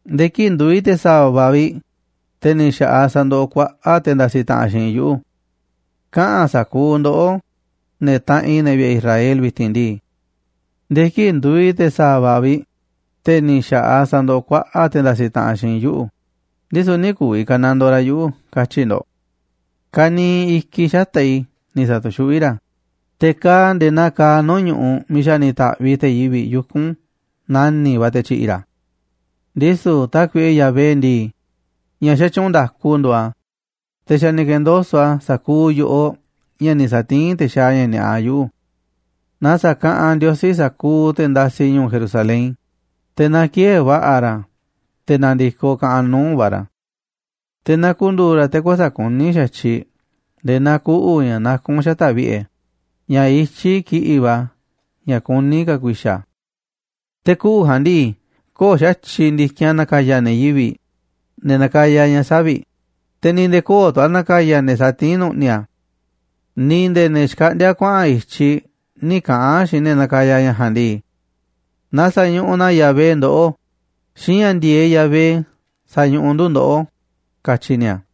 Nde̱e̱ kii̱ꞌ nduuꞌ i̱ te̱ sa̱va̱ vi̱ꞌ, te̱ ni̱ xa̱ꞌaꞌ sa̱ndoꞌoꞌ kuaꞌa̱ꞌ te̱ ndasiꞌ taꞌanꞌ xiinꞌ i̱ yuꞌu̱. Kaꞌa̱n sa̱kuuꞌ ndoꞌó, ne̱ taꞌanꞌ i̱, ne̱ vi̱ꞌe̱ Israel vi̱ti̱n ndii: “Nde̱e̱ kii̱ꞌ nduuꞌ i̱ te̱ sa̱va̱ vi̱ꞌ, te̱ ni̱ xa̱ꞌaꞌ sandoꞌoꞌ kuaꞌa̱ꞌ te̱ ndasiꞌ taꞌanꞌ xiinꞌ i̱ yuꞌu̱, ndisu̱ nï̱ ku̱vi̱ ka̱nandoo ra̱ yuꞌu̱”, katyi̱ ndo̱ꞌ. Ka̱niiꞌ i̱kiꞌ xata̱ꞌ i̱ ni̱ sa̱tu̱xuꞌví ra̱, te̱ kaaꞌ a̱ nde̱e̱ naa kaaꞌ nuu̱ꞌ ñu̱ꞌuꞌ miiꞌ xa̱ ni̱ ta̱ꞌviꞌ te̱ yivi̱ꞌ yuku̱n nani̱ꞌ va̱ te̱ tyi̱ꞌi̱ ra̱. Ndisu̱ Tákuiꞌe Yahvé ndii, ña̱ xatyuunꞌ nda̱ku nduuꞌ a̱, te̱ xa̱ ni̱ ke̱ndoso̱ꞌ a̱ sa̱kuuꞌ yo̱ꞌoꞌ ña̱ ni̱ sa̱tiín te̱ xaaꞌ ña̱ ni̱a̱ꞌa yuꞌu̱. Na sa̱kaꞌanꞌ Ndiosí sa̱kuuꞌ te̱ ndasiꞌ ñu̱u̱ Jerusalén, te̱ na ki̱ë̱e̱ va̱ꞌa̱ ra̱ te̱ na̱ndi̱koꞌ kaꞌanꞌ nuu̱ꞌ va̱ ra̱. Te̱ na ku̱ndu̱u̱ ra̱ te̱ kuäsa̱ꞌ kuní xa̱tyiꞌ nde̱e̱ naa kuꞌu̱ ña̱ nakún xata̱ꞌ vi̱ꞌe̱, ña̱ ityí kiꞌi̱ꞌ va̱ ña̱ kuní ka̱ ku̱i̱xa̱ a̱. Te̱ kuꞌu̱ ja̱a̱nꞌ ndii, köo̱ꞌ xa̱tyiꞌ ndi̱kinꞌ a̱ na̱ka̱ya̱ ne̱ yivi̱ꞌ, ne̱ nakaya ña̱ savi̱ꞌ, te̱ ni̱ nde̱e̱ köo̱ꞌ tu̱ a̱ na̱ka̱ya̱ ne̱ satiín nu̱ꞌni̱ a̱. Ni̱ nde̱e̱ ne̱ xkaꞌndíá kuaꞌa̱n i̱tyiꞌ nï̱ kaꞌa̱n xiinꞌ ne̱ nakaya ña̱ ja̱a̱nꞌ ndii: “Na sa̱ñuꞌuꞌ na Yahvé ndoꞌó. Xiinꞌ ña̱ ndi̱e̱eꞌ Yahvé sañuꞌuꞌ ndu̱ ndoꞌó”, katyi ni̱a̱.